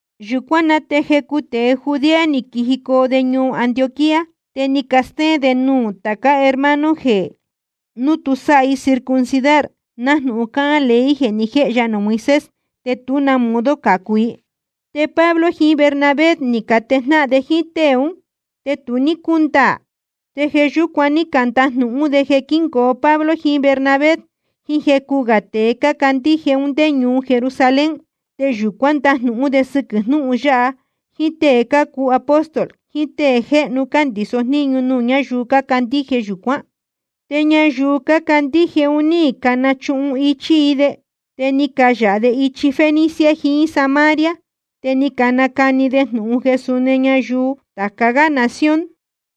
Yūcuán na te jecu tēe Judea ni quijicoo de ñuu Antioquía, te ni castéén de nuū tācá hermano jeē núu tu sáha i circuncidar, nájnūhun cáhán ley jeē ni jéhe ya nuū Moisés, te tú na modo cācu i. Te Pablo jiín Bernabé ni catejnáhan de jíín tée ún, te tu ní cúndaā. Te jeē yúcuan ní candajnūhún de jeē quíngoo Pablo jiín Bernabé jiín jecu gā tēe cácandíje un ndé ñuu Jerusalén, te yūcuán ndajnūhún de sɨquɨ̄ jnúhun yáha jíín tée cácuu apóstol jiín tée jéhnu cándīso jníñu nuū ñáyuu cácandíje yūcuán. Te ñayuu cácandíje un ní canachuhun íchí i de. Te ni cayāha de ichi Fenicia jiín Samaria, te cánacani de jnūhun jeē suni ñayuu tāca gá nación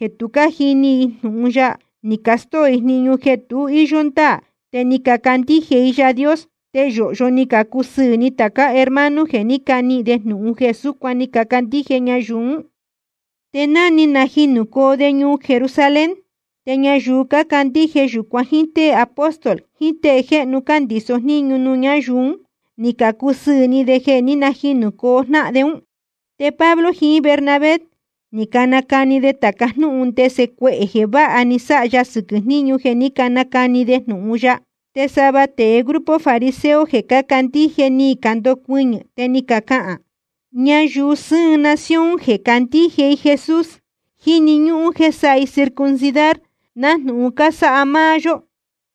jeē tu ní cájini i jnūhun ya, ni castóo i jniñu jeē tu íyó ndáā te ni cacandíje i Yaā Dios. Te yōhyo ni cacusɨɨ̄ ni tācá hermano jeē ní canihīn de jnūhun jeē súcuan ni cacandíje ñayuu ún. Te ni najinūcoo de ñuu Jerusalén, te ñayuu cácandíje yūcuan jíín tée apóstol jiín tée jéhnu cándīso jníñu nuū ñáyuu un, ní cacusɨɨ̄ ni de jeē ní najinūcoo jnáhan de ún. Te Pablo jiín Bernabé ni canacani de tāca jnúhun ndese cuehē jeē váha ni sáha ya sɨquɨ̄ jníñu jeē ní canacani de jnūhun ya. Te sava tēe grupo fariseo jeē cácandíje ni candocuɨñɨ̄ te ni cacahān: Ñayuu sɨ́ɨn nación jeē cácandíje i Jesús, jíni ñúhún jéē sáha i circuncidar nájnūhun cásáha máá yó,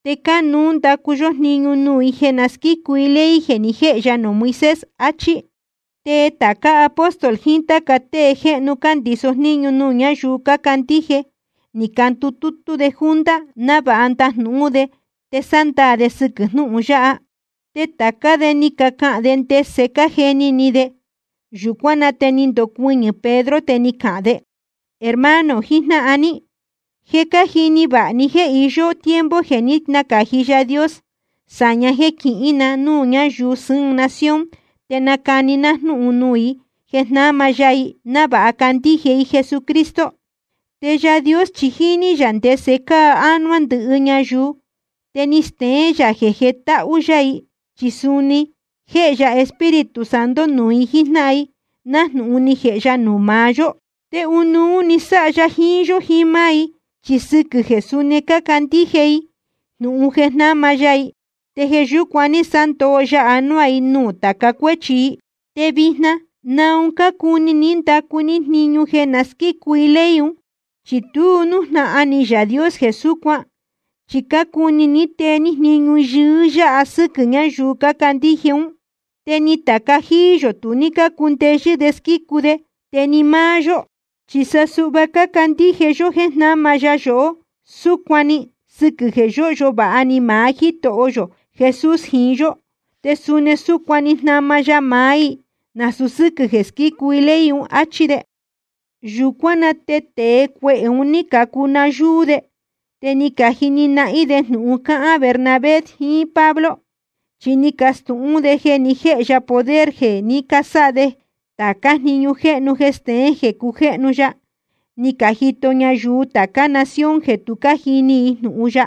te cánuú ndacu yó jniñu nuū i jeē na squícu i ley jeē ni jéhe ya nuū Moisés, áchí. Te tāca tée apóstol jiín táca tée jéhnu cándīso jníñu nuū ñáyuu cácandíje, ni candutútú de junta návāha ndajnūhún de te sándaā de sɨquɨ̄ jnúhun yáha. Te tācá de ni cacahān de ndese cájeni ni de. Yūcuán na te ni ndocuɨñɨ̄ Pedro, te ni cahān de: Hermano jijnáhan ní, je cájini vāha ni jéē je íyó tiempo jeē ní nacāji Yaā Dios sāña jéē quihín na núū ñáyuu sɨ́ɨn nación te nacani ná jnúhun nuū i jeē jnáma ya i, návāha candíje i Jesucristo. Te Yaā Dios chi jíní yā ndese cáa ánuá ndɨhɨ ñayuu, te ni steén yā jeē jetáhú yá i, chi suni ni jēhe ya Espíritu Santo nuū i jíjnáhan i, nájnūhun ni jēhe ya nuū maá yó. Te ɨnuú‑ni sáha ya jiín yó jiín máá i, chi sɨquɨ̄ jeē suni ni cacandíje i jnūhun jeē jnáma ya i, te jeē yúcuan ní sándoo ya anuá i nuū tāca cuéchi i. Te vijna ¿naun cácuni ní ndacu ní jniñu jeē na squícu i ley un? Chi tu nújnahan ni Yaā Dios jeē súcuan. Chi cácuni ní tee ní jniñu yɨɨ́ yáha sɨ́quɨ̄ ñáyuu cácandíje ún, te ni tāca jíí yō tu ní cácundeyɨ́ de squícu de, te ni máá yó. Chi sa suhva cácandíje yó jéē jnáma ya yohó súcuan‑ni sɨquɨ̄ jeē yóhyo vāha ni maá Jítoho yō Jesús jiín yó, te suni súcuan‑ni jnáma ya maá i, nasūu sɨ́quɨ̄ jeē squícu i ley un, áchí de. Yūcuán na te tēe cuehē un ní cacuu nayúú de, te ni cajini nahín de jnūhun cácahān Bernabé jiín Pablo. Chi ni cacastūhún de jeē ni jéhe ya poder jeē ní casáha de tācá jniñu jéhnu jeē steén jeē cujéhnu ya, ni cajito ñayuu tācá nación jeē tu cájini i jnūhun ya.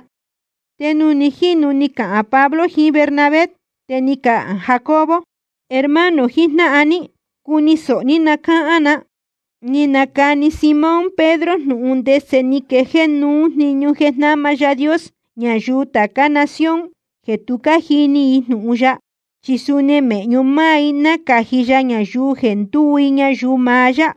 Te nuū ni jínu ni cacahān Pablo jiín Bernabé, te ni cahān Jacobo: Hermano jijnáhan ní, cuni sōho ní na cáhán na. Ni nacani Simón Pedro jnūhun ndese ni quejéé nuú jniñu jeē jnáma Yaā Dios ñayuu tācá nación jeē tu cájini i jnūhun ya, chi suni mēhñu máá i nácāji ya ñayuu jeē ndúu i ñayuu maá yá.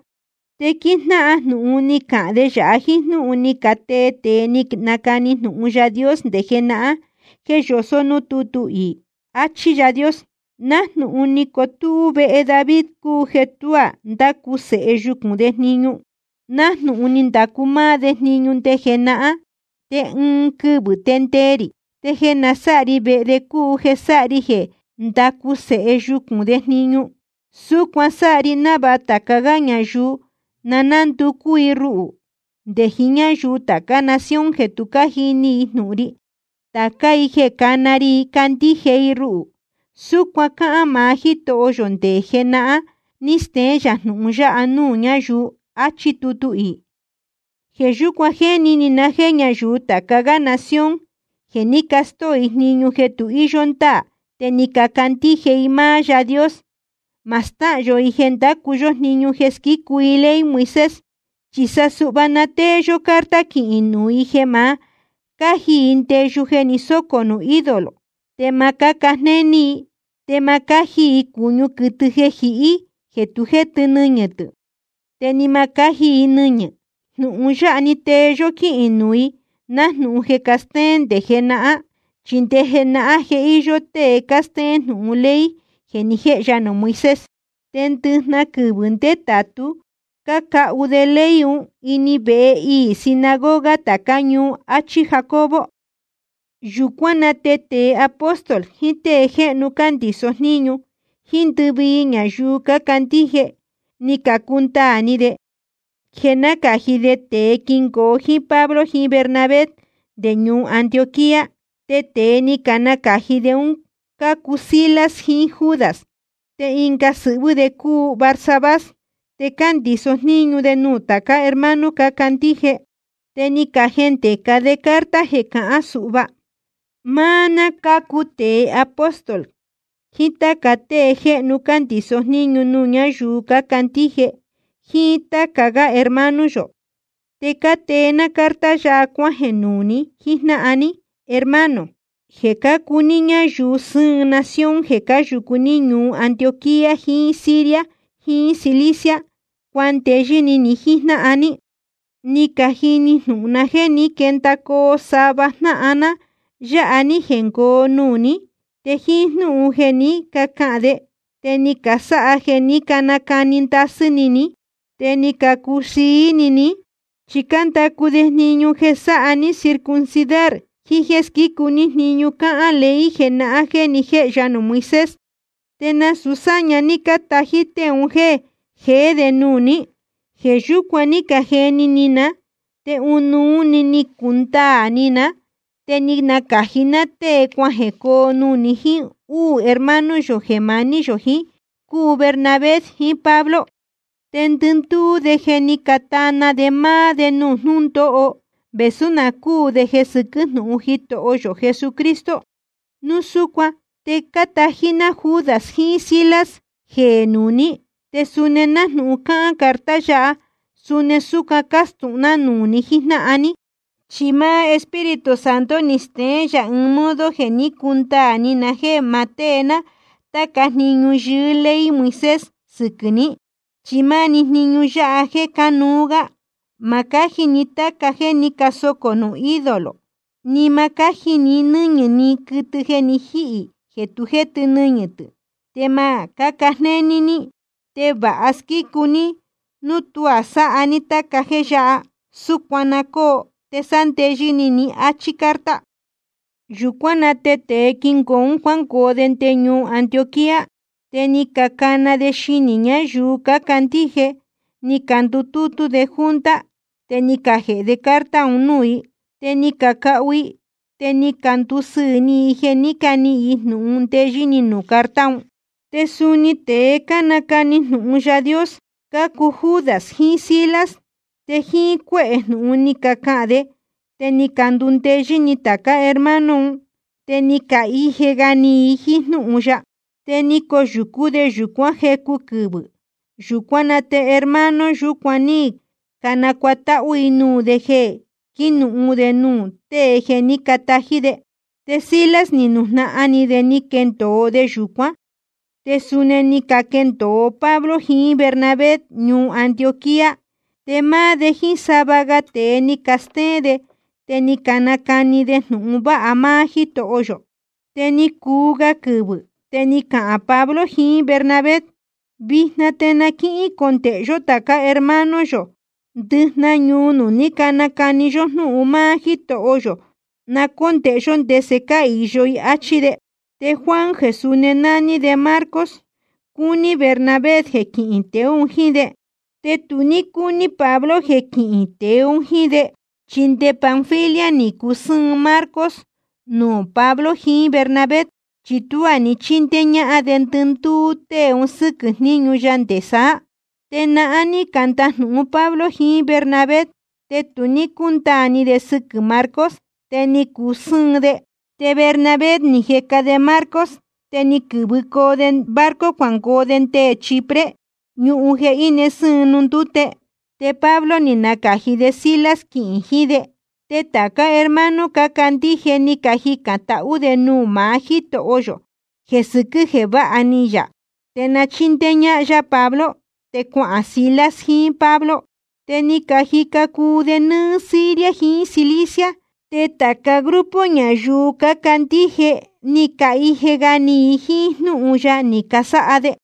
Te quíjnáhan jnūhun ni cahān de yāha jíín jnúhun ni catee tēe ni canacani jnūhun Yaā Dios nde jenahán jeē yosó núū tútu iī: Achí Yáā Dios: Nájnūhun ni cotúú vehe David cúu jeē tuá ndácu sēhe yucūn de jniñu, nájnūhun ni ndacu máá de jniñu nde jenahán. Te ɨɨn quɨvɨ̄ te ndee rī te jeē nasáha ri vehe de cúu jeē sáha ri jeē nandacu Sēhe yucūn de jniñu. Súcuan sáha ri návāha tāca gá ñayuu na nánducú i ruhū nde jiín ñáyuu tācá nación jeē tu cájini jnūhun ri, tācá i jeē cána ri i candíje i ruhū. Súcuan cáhán maá Jítoho yō, te nde jenahán ní steén yā jnūhun yáha núū ñáyuu. Achí tutu iī. ’Jeē yúcuan jéni ni na jéē ñáyuu tāca gá nación jeē ní castóo i jniñu jeē tu íyó ndáā te ni cacandíje i máá Yáā Dios, ma stáhān yō i jeē ndácu yó jniñu jeē squícu i ley Moisés. Chi sa suhva na tée yó carta quihīn nuū i jeē ma cáji i ndeyu jeē ni sócō nuū ídolo, te ma cáca jnéní i, te ma cáji i cūñu quɨtɨ jeē jihí jeē tu jétɨ nɨñɨ̄ tɨ̄, te ni ma cáji i nɨñɨ̄. Jnūhun yáha‑ni tee yó quíhīn nuū i nájnūhun je cástéén nde jenahán. Chi nde jenahán je íyó tée cástéén jnūhun ley jeē ni jéhe ya nuū Moisés, te ndɨjnahan quɨvɨ̄ ndétātu cácahu de ley un ini vehe iī sinagoga tācá ñuu, áchí Jacobo. Yūcuán na te tēe apóstol, jiín tée jéhnu cándīso jníñu, jíín ndɨvii ñayuu cácandíje, ni cacundaā ni de jeē nácāji de tēe quingoo jíín Pablo jiín Bernabé nde ñuu Antioquía. Te tēe ni canacāji de un cácuu Silas jiín Judas, te ɨnga sɨhvɨ́ de cúu Barsabás. Te cándīso jníñu de nuū tācá hermano cácandíje. Te ni cajendēca de carta jeē cahán suhva: Máá ná cácuu tēe apóstol, jiín táca tée jéhnu cándīso jníñu nuū ñáyuu cácandíje, jíín táca gá hermano yō. Te cátee ná carta yáha cuájeē nuū ni jíjnáhan ní, hermano, jeē cácuu ní ñáyuu sɨ́ɨn nación jeē cáyūcu ní ñuu Antioquía jiín Siria jiín Cilicia. Cuandeyɨ́ ni ni jíjnáhan ní. Ni cajini jnūhun ná jéē ní quendacoo sava jnáhan ná yáha ní jengoo nuū ní, te jíín jnúhun jeē ní cacahān de te ni casáha jeē ní canacani ndasɨ́ ni ní, te ni cacuxií ni ní, chi cándacu de jniñu jeē sáha ní circuncidar jiín jéē squícu ní jniñu cáhán ley jenahán jéē ni jéhe ya nuū Moisés. Te nasūu sáña ní cátají tée un jéē jeé de nuū ní. Jeē yúcuan ní cajeni ni ná, te ɨnuú‑ni ni cacundaā ni ná, te ni nacāji ná tée cuajēcoo nuū ni jíín úū hermano yō jeē maní yō jiín, cúu Bernabé jiín Pablo. Te ndɨndúú de je ni catana de máá de nuū jnúndóho vēsú na cúū de jeē sɨquɨ́ jnūhun Jitoho yō Jesucristo. Núu súcuan te cátají ná Judas jiín Silas jeē nuū ní, te suni nájnūhun cáhán carta yáha suni súcuan castūhún de nuū ni jíjnáhan ní. Chi máá Espíritu Santo ni steén yā ɨɨn modo jeē ní cacundaā ni na jéē ma tée ná táca jniñu yɨɨ́ ley Moisés sɨquɨ̄ ní, chi máá‑ni jniñu yáha jéē cánuú gá: Ma cáji ni táca jéē ní casocō nuū ídolo, ni ma cáji ni nɨ́ñɨ̄ ni quɨtɨ jeē jihí jeē tu jétɨ nɨñɨ̄ tɨ̄, te ma cáca jnéní ní. Te vāha squícu ní núu tuá sáha ní táca jéē yáha. Súcuan na cóo te sándeyɨ́ ni ní, áchí carta. Yūcuán na te tēe quingoo un cuángoo de nde ñuu Antioquía. Te ni cacana de xinī ñáyuu cácandíje ni candutútú de junta, te ni cajēhe de carta un núū i. Te ni cacahu i, te ni candusɨɨ̄ ni i jeē ni níhīn i jnūhun ndeyɨ́ ni nuū carta ún. Te suni tēe cánacani jnūhun Yaā Dios cácuu Judas jiín Silas, te jíín cuéhē jnūhun ni cacahān de te ni candundeyɨ́ ni tācá hermano un, te ni cahije ga ni i jíín jnúhun ya. Te ni coyūcú de yūcuán jecu quɨvɨ̄. Yūcuán na te hermano yúcuan ní canacuatáhú i nuū de jeē quinuhun de nuū tée jeē ní catají de. Te Silas ni nujnahan ni de ni quendōo de yūcuán. Te suni ni caquendōo Pablo jiín Bernabé ñuu Antioquía, te máá de jíín sava ga tēe ni castéén de te ni canacani de jnūhun vāha máá Jítoho yō. Te ni cuu ga quɨvɨ̄, te ni cahān Pablo jiín Bernabé: Vijna te na quícondēhe yó tācá hermano yō ndɨjnahan ñuu nuū ní nacani yó jnúhun máá Jítoho yō, na cóndēhe yó ndese cáhīyo i, áchí de. Te Juan jeē suni nání de Marcos, cúní Bernabé jeē quihín tēe un jíín de. Te tu ní cúní Pablo jeē quihín tēe un jíín de, chi nde Panfilia ni cusɨ́ɨn Marcos nuū Pablo jiín Bernabé, chi tuá ni chindéé ñáhán de ndɨndúú tée un sɨ́quɨ̄ jníñu ya nde saá. Te nahán ní candajnūhun Pablo jiín Bernabé, te tu ní cácundaā ni de sɨquɨ̄ Marcos, te ni cacusɨ́ɨn de. Te Bernabé ni jeca de Marcos, te ni quɨ̄vɨcoo de barco cuangoo de nde Chipre, ñuhun jeē íne sɨ́ɨn nuū ndúte. Te Pablo ni nacāji de Silas quihīn jiín de. Te tācá hermano cácandíje ni cajicān tahú de nuū maá Jítoho yō jeē sɨquɨ̄ jeē váha ni yā te na chíndéé ñáhán yá Pablo. Te cuahān Silas jiín Pablo. Te ni cajica cuu de nɨ́ɨ́ Siria jiín Cilicia. Te tāca grupo ñayuu cácandíje ni cahije ga ni i jíín jnúhun ya ni casáha de.